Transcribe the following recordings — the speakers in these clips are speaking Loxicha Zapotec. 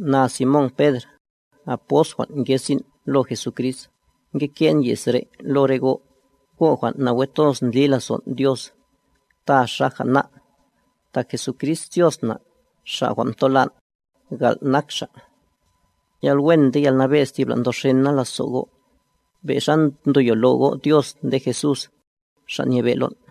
Na, Simón Pedr, apost jwan' nge sin' lo Jesucrist, nge nke'n ye's re' lo go', go' jwan' nawe toz ndli lazon' Dios, ta xaja ná', tak Jesucrist Dios na', Xa' jwan' mtolan', gal' nak Xa'. Yalwen nde yalnabe'z thibla ndoxena lazo' go', be' xa ndoyolo go' Dios nde Jesús, Xa' Nyebe' lon'.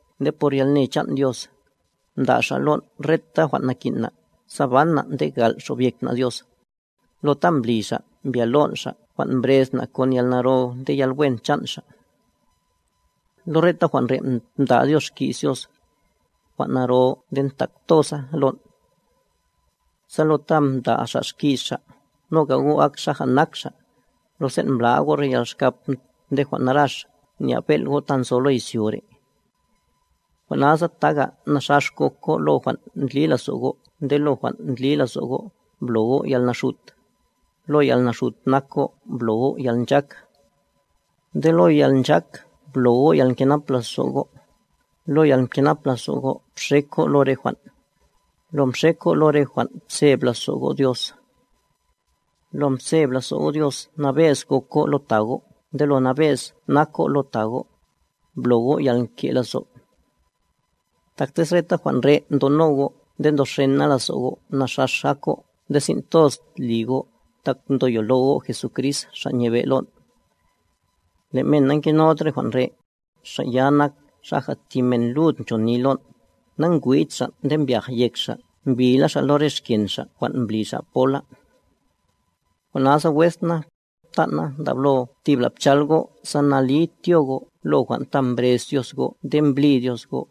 Nde por yalne chan' Dios, mda' Xa' lon' reta jwan' nakin' na' sa ban na' nde gal' xobyek na' Dios, lo ta mbli Xa' mbyolon' Xa' jwan' mbrez na' kon yalnaro nde yalwen chan' Xa'. Lo reta jwan' re' mda' Dios xki's Dios, jwan' naro nde ntak toza lon'. Sa lo ta mda' Xa' xki's Xa', noga go' ak xaja nak Xa', lo sen' mbla'a go' re yalxkap nde jwan' narax nya'b bel' go' ta nzo lo izyo re'. Jwan' nasa taga, naxax gok go' lo jwan' ndli lazo' go' nde lo jwan' ndli lazo' go' blo go' yalnaxut, lo yalnaxut nak go' blo go' yalnchak. Nde lo yalnchak blo go' yalkenap lazo' go'a, lo yalkenap lazo' go' bxek go' lo re jwan', lo mxek go' lo re jwan' pseb lazo' go' Dios, lo mzeb lazo' go' Dios nabe'z gok go' lo ta go' nde lo nabe'z nak go' lo ta go', blo go' yalke' lazo'. Tak tez reta jwan' re' ndono go' nde ndoxena lazo' go', naxax ak go' nde sin' toz li go' tak ndoyolo go' Jesucrist Xa' nyebe' lon'. Le' men nangenod re jwan' re', xa' ya nak xaja thi men lud nchoni lon', nangwid xa', nde mbyaj yek xa' mbila xa' lo re xken xa' jwan' mbli xa' pola. Jwan' nasa wes na, ptan' na, ndablo thibla' pchal go' sa nali tyo go' lo jwan' ta mbrez Dios go' nde mblí Dios go',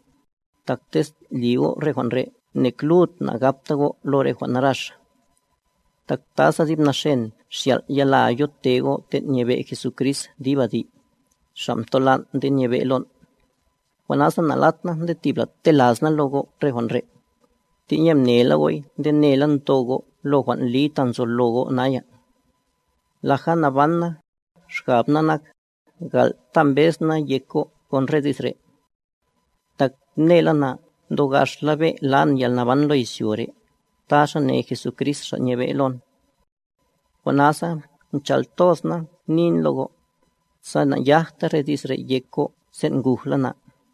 tak tez li go' re jwan' re' nek lud na'gabta go' lo re jwan' narax. Tak ta sa dib naxen xyal' yala yote go' ten' nyebe' Jesucrist dib adi', Xa' mtolan' nde nyebe' lon'. Jwan' nasa na'lat na nde thibla tela's na lo go' re jwan' re', tenye mnela go'y nde nela ndo go' lo jwan' li ta nzolo go' naya. Laja naban na, xgab na nak, gal' ta mbez na yek go' kon re di's re'. Tak mnela na ndogaxla be' lan yalnaban lo izyo re', ta xa ne Jesucrist Xa' nyebe', lon. Jwan' nasa chal toz na nin lo go', sa nayajta re di's re' yek go' sen' ngujla na.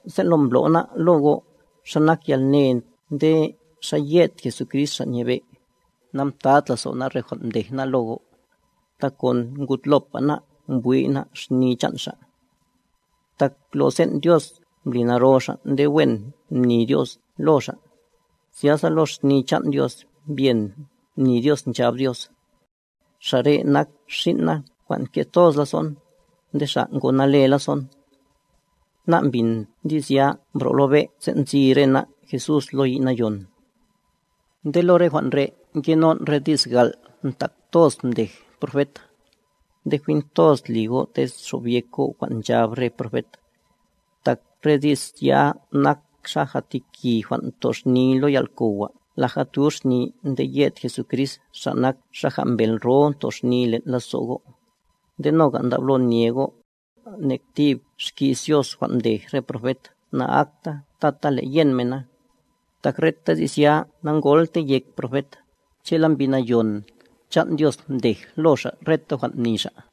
Sen' lo mblo' ná' lo go' xa nak yalne nde xa ye'd Jesucrist Xa' nyebe', namtad lazo' ná' re jwan' mdej ná' lo go', tak kon ngudlopa ná' mbwi' ná' xni chan' Xa'. Tak lo sen' Dios mbli naro Xa' nde wen mni Dios lo Xa', zyasa lo xni chan' Dios mbyen mni Dios nchab Dios: “Xa' re' nak Xin' na jwan' nke' toz lazo'n, nde Xa' ngo nale lazo'n.” Ná' mbin di's ya mbro' lo be' sen' nzi re ná' Jesús lo yi' nayon. Nde lo re jwan' re' ngenon' re di's gal' ntak toz mdej profet, nde jwin toz li go' tez xobyek go' jwan' nchab re profet, tak re di's ya nak xaja thi ki jwan' ntoxni lo yal'kowa laja tuxni nde yed Jesucrist Xa' nak xaja mbel ro toxni len' lazo' go'. Nde noga' ndablo nye go', nek thib xki's Dios jwan' mdej re profet na'akta tata le' yen mena, tak reta di's ya nangoltey yek profet, che'la Mbi Nayon chan' Dios mdej lo xa' reta jwan' mni xa'.